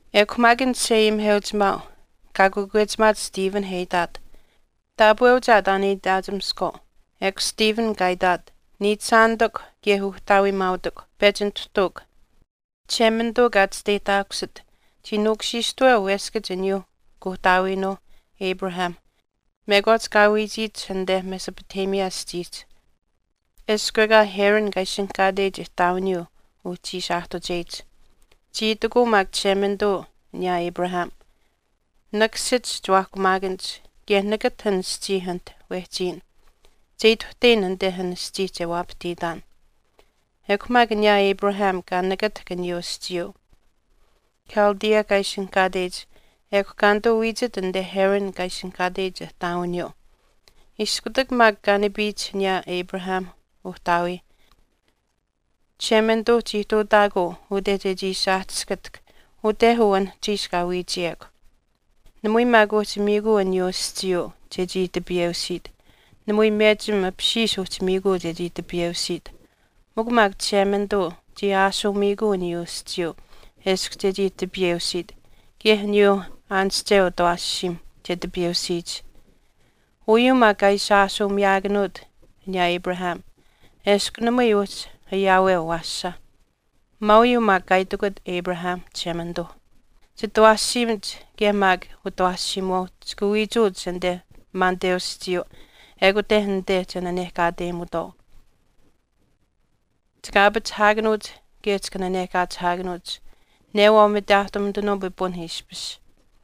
Ekw maak an chisheayimiheuchimaau kaa kakwechimaat Stephen e itaat, “Taapweuch aa taan e itaachimiskwaau.” Ekw Stephen kaa itaat, “Niichishaanitikw kaye uhtaawiimaautikw. Pechi nituhtuukw. Chishemanituu kaa chisteyihtaakusit chii nuukushiishtaweu weskach aniyaa kuuhtaawiinuuh Abraham mekwaach kaa wiichiyich anite Mesopotamia aschiihch, eshkw ekaa Haran kaa ishinihkaateyich ihtaawiniyuu uhchi ishi aahtucheyich. Chii itikuu maak Chishemanituu aniyaa Abraham, Nakasich chiwaahkumaakanich kaye nakatah an aschii anit wehchiyin. Che ituhteyin anite an aschii che waapahtiitaan. Ekw maak aniyaa Abraham kaa nakatahk aniyuu aschiiyuu Chaldea kaa ishinihkaateyich ekw kaa nituu wiichit anite Haran kaa ishinihkaateyich ihtaawiniyuu. Iskutak maak kaa nipiyich aniyaa Abraham uhtaawii, Chishemanituu chii ihtuutaakuu ute chechii ishi aahtiskatahk ute uu anuhchiish wehchiyekw. Namui maak uhchi miikuu aniyuu aschiiyuu chechii tipiyeusiit, namui mechim apishiish uhchi miikuu chechii tipiyeusiit. Mikw maak Chishemanituu chii ashuu miikuu aniyuu aschiiyuu eshkw chechii tipiyeusiit kaye aniyuuh aanische utawaashiim che tipiyeusiyich. Uyuu maak kaa ishi ashuu miyaakanuut aniyaa Abraham eshkw namui uhchi ayaaweu awaasha. Maauyuu maak kaa itikut Abraham, Chishemanituuh, ‘Chitawaashiimach kaye maak utawaashiimuwaau chika wiichuuch anite maaniteu aschiiyuu ekute anite che nanehkaateyimutwaau. Chika aapachihaakanuuch kaye chika nanehkaachihaakanuuch newaau mitaahtumitanuu pipun ishpish.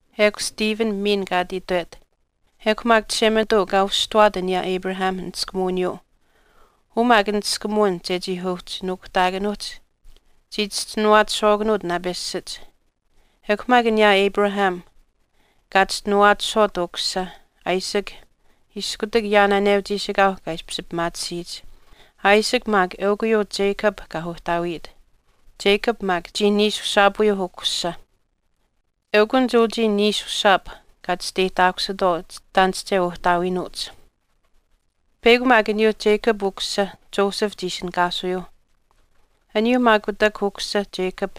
Ekw Stephen miin kaa ati itwet, “Ekw maak Chishemanituu kaa usihtuwaat aniyaa Abraham niskumuwiniyuu, uu maak niskumuwin chechii uhchi nuukuhtaakanuuhch, chii chischinuwaachishwaakanuuch naapeshach. Ekw maak aniyaa Abraham kaa chischinuwaachishwaat ukusisa Isaac iskutak yaanaaneu chiishikaau kaa ishpish pimaatisiyich. Isaac maak eukw uyuu Jacob kaa uhtaawiyit. Jacob maak chii niishushaapuyuu ukusisa. Eukunich uchii niishushaap kaa chisteyihtaakusitwaau chitaanische uhtaawiinuuch.” “Peyakw maak aniyuu Jacob ukusisa Joseph chii ishinihkaasuyuuh. Aniyuu maak kutak ukusisa Jacob,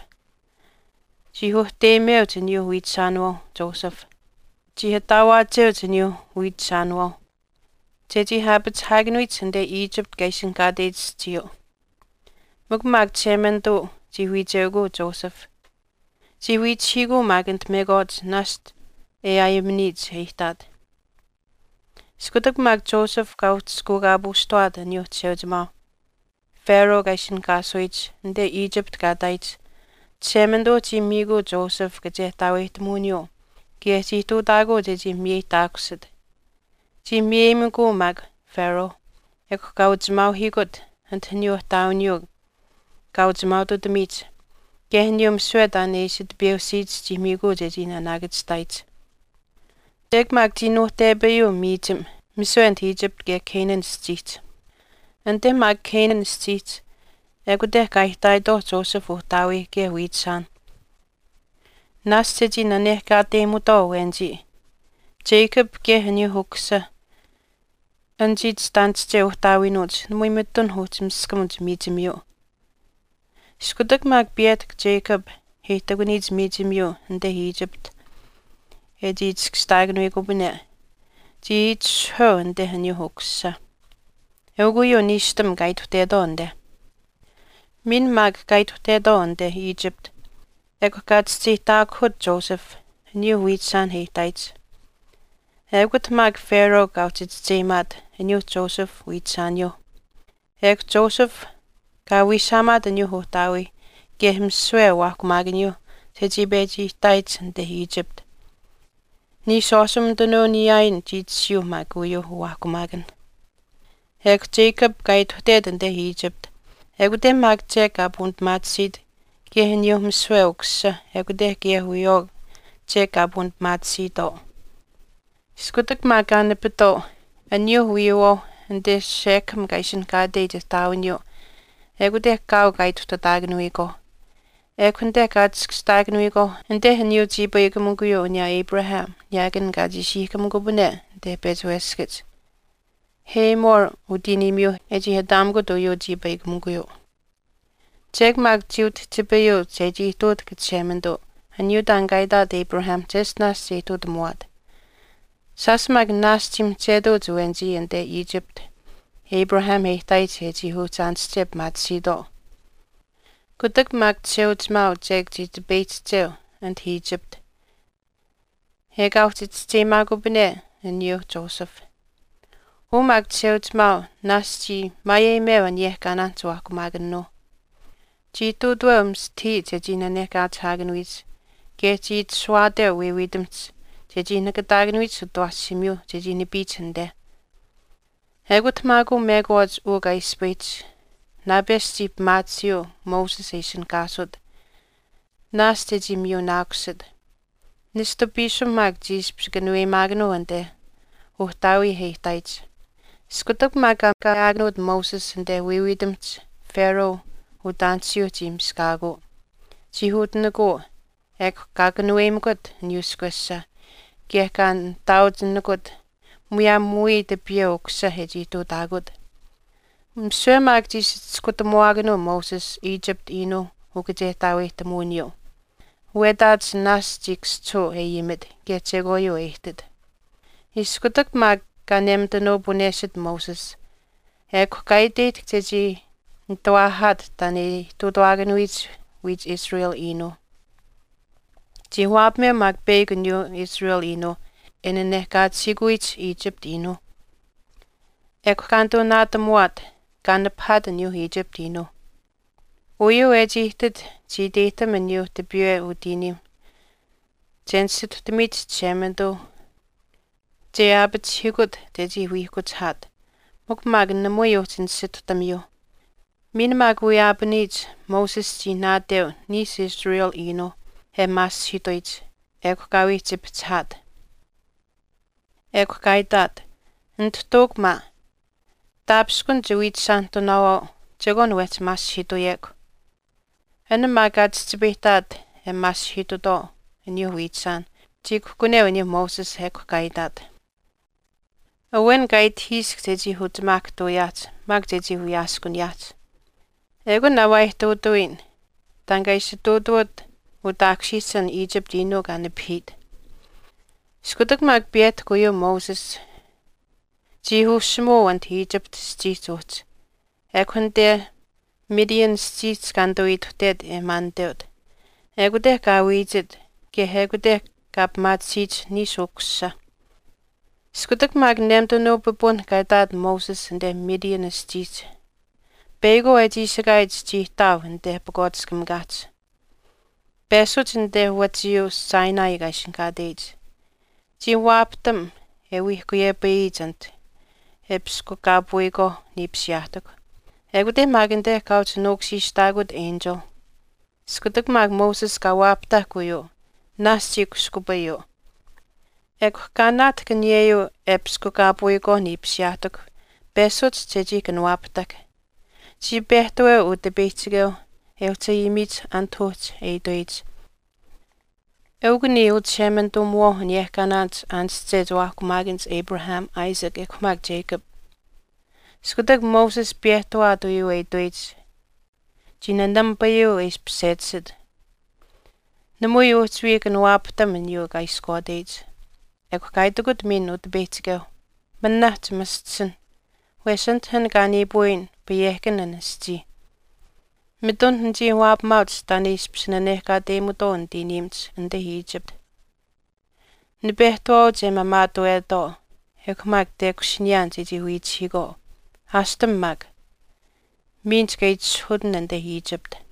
chii uhteyimeuch aniyuu wiichishaanawaau Joseph. Chii ataawaacheuch aniyuu wiichishaanawaau chechii aapachihaakanuyich anite Egypt kaa ishinihkaateyich aschiiyuu. Mikw maak Chishemanituuh chii wiicheukuu Joseph. Chii wiichihiikuu maak anit mekwaach naashch e aayimaniyich e ihtaat. Iskutak maak Joseph kaa uhchishkuukaapuushtawaat aniyuu chisheuchimaau Pharaoh kaa ishinihkaataakanuyich anite Egypt kaa ihtaayich, Chishemanituu chii miikuu Joseph kachehtaaweyihtamuwiniyuu kaye chii ihtuutaakuu chechii miyeyihtaakusit. Chii miyeyimikuu maak Pharaoh, ekw kaa uchimaauhiikut anit aniyuu ihtaawiniyuu kaa uchimaaututamiyich kaye aniyuu misiwe taan e ishi tipiyeusiyich chii miikuu chechii naanaakachihtaayich.” “Chek maak chii nuuhtepayuu miichim misiwe anit Egypt kaye Canaan aschiihch. Anite maak Canaan aschiihch ekute kaa ihtaayitwaauh Joseph uhtaawii kaye wiichishaanh. Naashch e chii nanehkaateyimutwaau awenichii. Jacob kaye aniyuu ukusisa anichii chitaanische uhtaawiinuuch namui mitun uhchi miskamuch miichimiyuu. Iskutak maak piyehtahk Jacob e ihtakuniyich miichimiyuu anite Egypt e chii chiskashtaakanuyikupane, chii itishahweu anite aniyuu ukusisa. Eukw uyuu niishtam kaa ituhtetwaau anite. Miin maak kaa ituhtetwaau anite Egypt ekw kaa chischeyihtaakuhut Joseph aniyuu wiichishaan e ihtaayich. Ekut maak Pharaoh kaa uhchi chischeyimaayich aniyuuh Joseph wiichishaaniyuuh. Ekw Joseph kaa wiishaamaat aniyuu uhtaawii kaye misiwe uwaahkumaakaniyuu chechii pechi ihtaayich anite Egypt. Niishwaashumitanuu niyaayin chii tashiyuu maak uyuuh uwaahkumaakanh. Ekw Jacob kaa ituhtet anite Egypt, ekute maak chek kaa puunipimaatisiit kaye aniyuu misiwe ukusisa ekute kaye wiyawaau chek kaa puunipimaatisiitwaau. Iskutak maak kaa nipitwaau aniyuuh wiiyuuwaauh anite Shechem kaa ishinihkaateyich ihtaawiniyuu ekute kaau kaa ituhtataakanuyikwaau. Ekw anite kaa chiskashtaakanuyikwaauh anite aniyuu chiipaikamikuyuu aniyaa Abraham niyaakan kaa chiishiihkamikupane anite pechi weskach. Hamor utiiniimiyuu e chii ataamikut uyuu chiipaikamikuyuu.” “Chek maak chii utihchipayuu chechii ihtuutahk Chishemanituu aniyuu taan kaa itaat Abraham cheshtinaash che ihtuutamuwaat. Shaash maak naashch chii mihchetuuch awenichii anite Egypt Abraham e ihtaayich e chii uhchi aanische pimaatisiitwaau. Kutak maak chisheuchimaau chek chii tipeyihchicheu anit Egypt ekaa uhchi chischeyimaakupane aniyuu Joseph. Uu maak chisheuchimaau naashch chii maayeyimeu aniyehkaanaan chiwaahkumaakanuu, chii ihtuutaweu mistahii chechii nanehkaachihaakanuyich kaye chii itashuwaateu wiiwiitamihch chechii nakataakanuwiyich utawaashiimiyuu chechii nipiyich anite.” “Ekut maak uu mekwaach uu kaa ispayihch naapesh chii pimaatisiyuu Moses e ishinihkaasut, naashch e chii miyunaakusit. Nishtu piisim maak chii ishpish kanuweyimaakanuu anite uhtaawii e ihtaayich. Iskutak maak kaa kaayaakanuut Moses anite wiiwiitamihch Pharaoh utaanisiyuu chii miskaakuu, chii utinikuu, ekw kaa kanuweyimikut aniyuu ishkwesha kaye kaa nihtaauchinikut muyaam wiya tipiyeu ukusisa e chii ihtuutaakut. Misiwe maak chii ishi chiskutamuwaakanuu Moses Egypt iinuu ukachehtaaweyihtamuwiniyuu. Wetaach naashch chii kaschihuu e ayimit kaye chekwaayuu e ihtit.” “Iskutak maak kaa nemitanuu puneshit Moses ekw kaa iteyihtahk chechii nitawaahaat taan e ihtuutawaakanuyich wiich israel iinuuh. Chii waapameu maak peyakw aniyuu Israel iinuu e nanehkaachihiikuyich Egypt iinuu. Ekw kaa nituu naatamuwaat kaa nipahaat aniyuu Egypt iinuu. Uyuu e chii ihtit chii iteyihtam aniyuu tipiiweu utiiniim che nisituhtamiyich Chishemanituu che aapachihiikut chechii wiihkuchihaat, mikw maak namui uhchi nisituhtamiyuu. Miin maak wiyaapaniyich, Moses chii naateu niishu Israel iinuu e maasihiituyich, ekw kaa wii chipihchihaat. Ekw kaa itaat, ‘Nituhtuukw maa, taapishkun chiwiichishaanihtunaawaau chekwaan wehchi maasihiituyekw.’” “An maak kaa chihchipayihtaat e maasihiitutwaau aniyuuh wiichishaan chii kuhkuneu aniyuu Moses. Ekw kaa itaat, ‘Awen kaa itahiisk chechii uchimaahkahtuuyaahch maak chechii wiyaaskuniyaahch. Ekun aa waa ihtuutawiyin taan kaa ishi ihtuutuwat utaakushiyich an Egypt Iinuu kaa nipahiit.’ Iskutak maak piyehtahk uyuu Moses, chii ushimuu anit Egypt aschiihch uhchi, ekw anite Midian aschiihch kaa nituu ihtaat e maaniteut. Ekute kaa wiichit kaye ekute kaa pimaatisiyich niishu ukusisa.” “Iskutak maak nemitanuu pipun kaa ihtaat Moses anite Midian aschiihch, peyakwaau e chiishikaayich chii ihtaau anite pakwaatiskamikaahch, peshuch anite wachiyuu Sinai kaa ishinihkaateyich. Chii waapahtam e wiihkuyepayiyich anit e piskukaapuyikwaau niipisiyaahtikw, ekute maak anite kaa uhchi nuukushiishtaakut enchil. Iskutak maak Moses kaa waapahtahk uyuu naashch chii kushkupayuu. Ekw kaa naatahk aniyeyuu e piskukaapuyikwaau niipisiyaahtikw peshuch chechii kanawaapahtahk. Chii pehtaweu Utipeyihchikeu e uhchi ayimiyich anit uhchi e itweyich, ‘Eukw niya Uchishemanituumiwaau, aniyehkaanaanich aanische chiwaahkumaakanich Abraham, Isaac ekw maak Jacob.’ Iskutak Moses piyehtawaat uyuu e itweyich chii nanamipayuu e ishpish sechisit, namui uhchi wii kanawaapahtam aniyuu kaa ishkwaateyich.” “Ekw kaa itikut miin Utipeyihchikeu, ‘Manah chimaschisinh, wesh anit an kaa niipuuyin payehkan an aschii. Mitun nichii waapamaauch taan e ishpish nanehkaateyimutwaau nitiiniimach anite Egypt. Nipehtawaauch e maamaatuwetwaau ekw maak tekushiniyaan chechii wiihkuchihiikwaau. Aashtam maak, miin chika itishahuutin anite Egypt.’”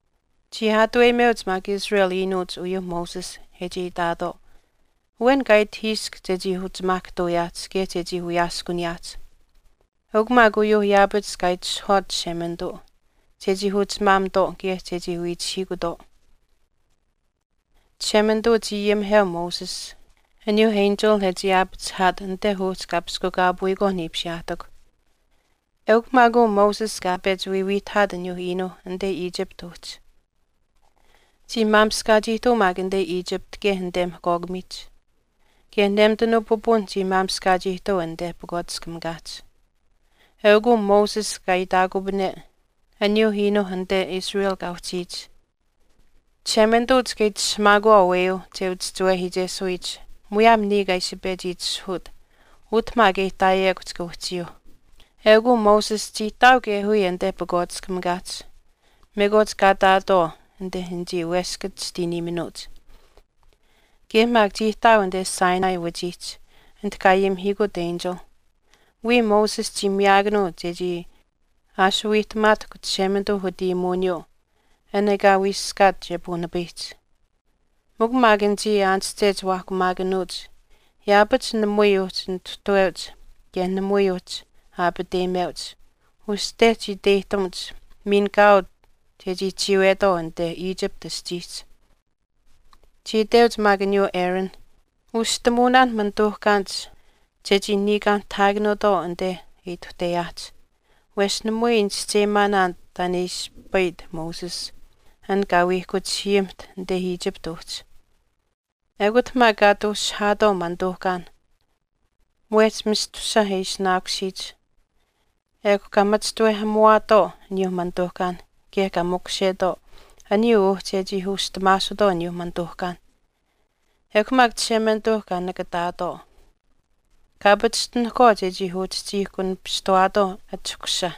“Chii aatuweyimeuch maak Israel Iinuuch uyuu Moses e chii itaatwaau, ‘Awen kaa itahiisk chechii uchimaahkahtuuyaahch kaye chechii wiyaaskuniyaahch.’ Eukw maak uyuuh yaapach kaa itishahwaat Chishemanituu chechii uchimaamitwaau kaye chechii wiihkuchihiikutwaau. Chishemanituu chii ayimiheu Moses aniyuu enchil e chii aapachihaat anite uhchi kaa piskukaapuyikwaau niipisiyaahtikw. Eukw maak uu Moses kaa pechi wiiwiihtahaat aniyuu iinuu anite Egypt uhchi. Chii maamishkaach ihtuu maak anite Egypt kaye anite Mihkwaakamiihch kaye nemitanuu pipunh chii maamishkaach ihtuu anite pakwaatiskamikaahch. Eukw uu Moses kaa itaakupane aniyuu iinuu anite Israel kaa uhchiyich, Chishemanituu chika itishahamaakuwaau aweyuu che uchischiwehiichesuyich muyaam niya kaa ishi pechi itishahuut, utah maak e uhchiyekw chika uhchiyuuh. Eukw uu Moses chii ihtaau kaye wiya anite pakwaatiskamikaahch mekwaach kaa ihtaatwaau anite anichii weskach chitiiniiminuuch. Kaye maak chii ihtaau anite Sinai wachiihch Sinai anit kaa ayimihiikut enchil. Wiya Moses chii miyaakanuu chechii aashuuwiihtamaatahkw Chishemanituu utayimuwiniyuu an ekaa wiiskaat che puunipayihch.” “Mikw maak anichii aanische chiwaahkumaakanuuch yaapach namui uhchi nituhtaweuch kaye namui uhchi aapateyimeuch, uste chii iteyihtamuch miin kaau chechii chiiwetwaau anite Egypt aschiihch. Chii iteuch maak aniyuu Aaron, ‘Ushihtamuunaan manituuhkaanich chechii niikaanihtahaakanuutwaau anite e ituhteyaahch, wesh namui nichischeyimaanaan taan e ispayit Moses, an kaa wiihkuchihiyimiht anite Egypt uhchi.’ Ekut maak kaa ati ushihaatwaau manituuhkaan mwehch mistusush e ishinaakusiyich ekw kaa machishtawehamuwaatwaau aniyuu manituuhkaan kaye kaa makushetwaau aniyuu uhchi e chii ushitamaasutwaau aniyuu manituuhkaan. Ekw maak Chishemanituuh kaa nakatikutwaau, kaa pachishtinikutwaau chechii uchihchiihkunapishtuwaatwaau achahkusha.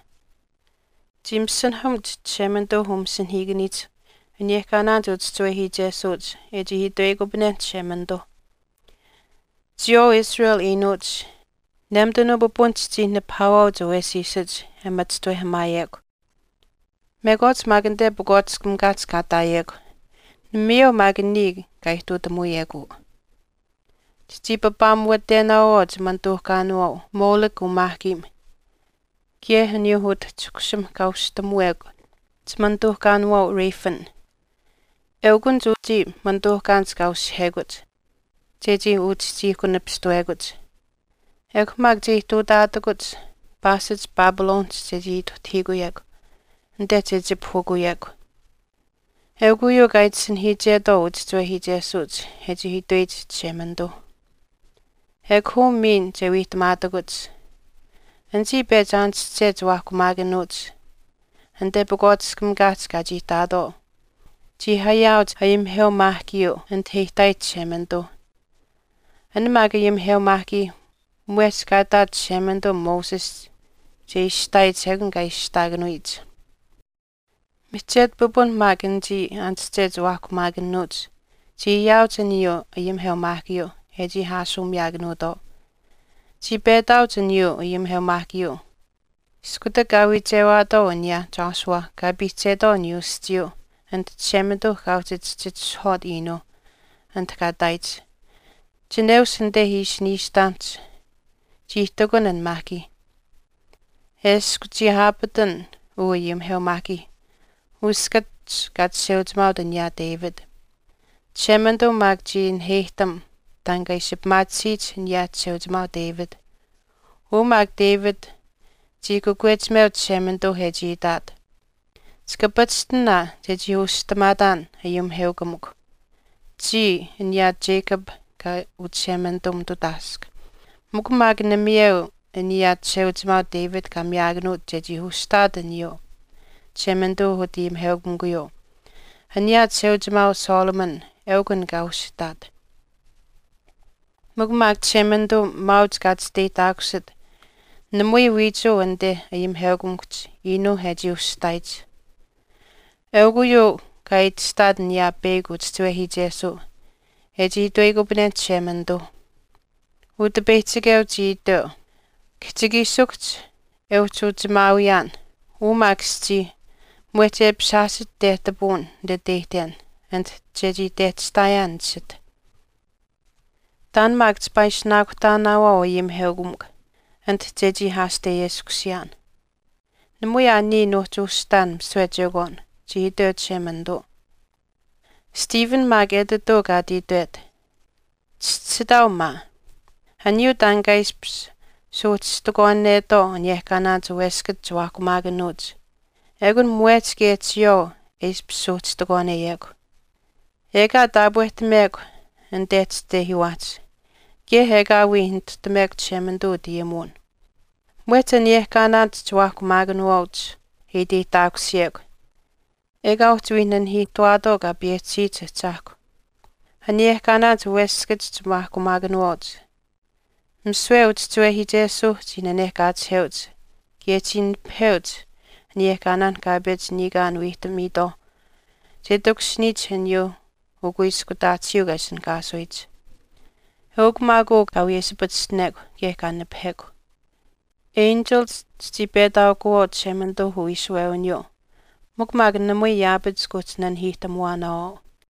Chii masinahamuch Chishemanituu umasinahiikaniihch aniyehkaanaanich uchischiwehiichesuuch e chii itweyikupanenh Chishemanituu, Chiyawaau Israel iinuuch, nemitanuu pipun chichii nipahaawaauch awesiisach e machishtawehamaayekw, mekwaach anite pakwaatiskamikaahch kaa ihtaayekw, namayeu maak niya kaa ihtuutamuuyekw uu. Chichii papaamuwatenaawaau chimanituuhkaanawaau Molech umaahkiim kaye aniyuu utachahkushim kaa ushihtamuwekw an chimanituuhkaanawaau Rephan. Eukunich uchii manituuhkaanich kaa ushihekuch chechii uchihchiihkunapishtuwekuch. Ekw maak che ihtuutaatakuch paashich Babylonihch chechii ituhtahiikuyekw anite che chipahukuyekw. Eukw uyuu kaa itisinahiichetwaau uchischiwehiichesuuch e chii itweyich Chishemanituu.” “Ekw uu miin che wiihtamaatakuch, anichii pechi aanische chiwaahkumaakanuuch anite pakwaatiskamikaahch kaa chii ihtaatwaau, chii ayaauch ayimiheumaahkiyuu anit e ihtaayich Chishemanituu. An maak ayimiheumaahkii mwehch kaa itaat Chishemanituu Moses che ishihtaayich ekun kaa ishihtaakanuyich. Mihchetu pipun maak anichii aanische chiwaahkumaakanuuch chii ayaauch aniyuu ayimiheumaahkiyuu e chii aashuumiyaakanuutwaau. Chii petaauch aniyuu ayimiheumaahkiyuu iskutak kaa wiichewaatwaau aniyaa Joshua kaa piihchetwaau aniyuu aschiiyuu anit Chishemanituu kaa uhchi chihchitishahwaat iinuu anit kaa ihtaayich. Chineush anite ishi niishtamihch chii ihtakun an maahkii. Eshkw chii aapatan uu ayimiheumaahkii uskach kaa chisheuchimaaut aniyaa David. Chishemanituu maak chii naheyihtam taan kaa ishi pimaatisiyich aniyaa chisheuchimaau David. Uu maak David chii kakwechimeu Chishemanituu e chii itaat, ‘Chika pachishtin aa chechii ushihtamaataan ayimiheukamikw, chiya aniyaa Jacob kaa uchishemanituumitutaask.’ Mikw maak namayeu aniyaa chisheuchimaau David kaa miyaakanuut chechii ushihtaat aniyuu Chishemanituu utayimiheukamikuyuu, aniyaa chisheuchimaau Solomon eukw an kaa ushihtaat.” “Mikw maak Chishemanituu maauch kaa chisteyihtaakusit namui wiichuu anite ayimiheukamikuhch iinuu e chii ushihtaayich. Eukw uyuu kaa itashtaat an peyakw uchischiwehiichesuu e chii itweyikupanenh Chishemanituu, Utipeyihchikeu iteu, ‘Kihchikiishikuhch e uhchi uchimaawiyaan, uu maak aschii mwehch e apishaashich tehtapuun nititeyihten anit chechii tehtashtaayaan nisith. Taan maak chipaa chii ishinaakuhtaanaawaau ayimiheukamikw anit chechii aasteyeskusiyaan. Namui aa niya nuuhchi ushihtaan misiwe chekwaan,’ chii itweu Chishemanituu.” Stephen etituu kaa ati itwet, “Chischisitaau maa, aniyuu taan kaa ishpish suuhchishtikwaanetwaau aniyehkaanaanich weskach chiwaahkumaakanuuch ekun mwehch kaye chiyawaau e ishpish suuhchishtikwaaneyekw. Ekaa taapwehtamekw anite chitehiiwaahch, kaye ekaa wii nituhtamuwekw Chishemanituu utayimuwin. Mwehch aniyehkaanaanich chiwaahkumaakanuwaauch e iteyihtaakusiyekw ekaa uhchi wii nanihiihtuwaatwaau Kaa payehchisiyich Ahchaahkwa. Aniyehkaanaanich weskach chiwaahkumaakanuwaauch, misiwe uchischiwehiichesuuh chii nanehkaachiheuch. Kaye chii nipaheuch aniyehkaanaanh kaa pechi niikaan wiihtamiitwaau che takushiniyich aniyuu Ukuiskutaatisiiu kaa ishinihkaasuyich. Eukw maak uu kaa wiyesipachishtinekw kaye kaa nipahekw. Enchilich chichii petwaakuwaauch Chishemanituu uwiishuwewiniyuu mikw maak namui yaapach kuuhchi nanihiihtamuwaanaawaau.”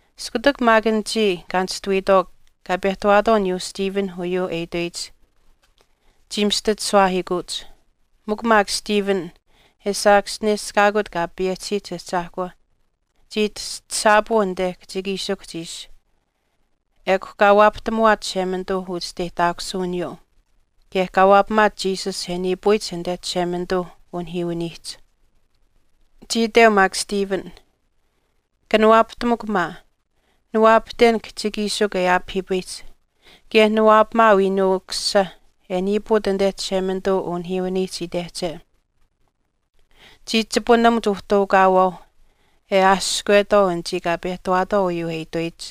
Iskutak maak anichii kaa nishtuwiitwaau kaa pehtawaatwaau aniyuu Stephen uyuu e itweyich, chii mistachishuwaahiikuuch. Mikw maak Stephen e saakaschineshkaakut Kaa payehchisiyich Ahchaahkwa chii tastasaapuu anite kihchikiishikuhch ishi, ekw kaa waapahtamuwaat Chishemanituu uchisteyihtaakusuwiniyuu kaye kaa waapamaat Jesus e niipuyich anite Chishemanituu unihiiwiniihch. Chii iteu maak Stephen, “Kanawaapahtamukw maa, niwaapahten kihchikiishikw e aapahiipayihch kaye niwaapamaau Iinuu Ukusisa e niipuut anite Chishemanituu unihiiwiniihch itehche.” Chii chipunamuch uhtaukaawaauh e aashkwetwaau anichii kaa pehtawaatwaau uyuu e itweyich.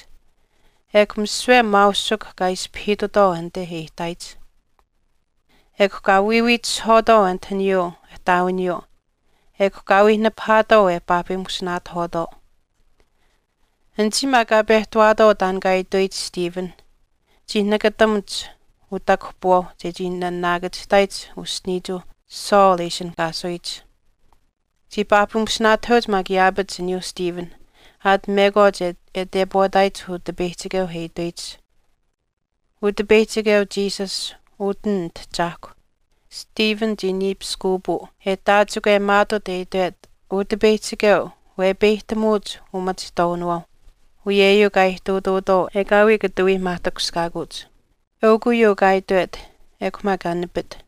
Ekw misiwe maausikw kaa ispahiitutwaau anite e ihtaayich. Ekw kaa wiiwiitishihwaatwaau anit aniyuu ihtaawiniyuu ekw kaa wii nipahaatwaau e paahpimusinaatahwaatwaau. Anichii maak kaa pehtawaatwaau taan kaa itweyich Stephen chii nakatamuch utakuhpiwaauh chechii naanaakachihtaayich uschiniichuu Saul e ishinihkaasuyich. Chii paahpimusinaatahweuch maak yaapach aniyuu Stephen aat mekwaach e tepwaataayich Utipeyihchikeu e itweyich, “Utipeyihchikeu Jesus, utin nitahchaahkw.” Stephen chii niipiskuupuu, e taachikwemaatuut e itwet, “Utipeyihchikeu, wepeyihtamuuch umachihtwaawinawaau.” Uyeyuu kaa ihtuutuutwaau ekaawii kata wii maahtakushkaakuuch. Eukw uyuu kaa itwet, ekw maak kaa nipit.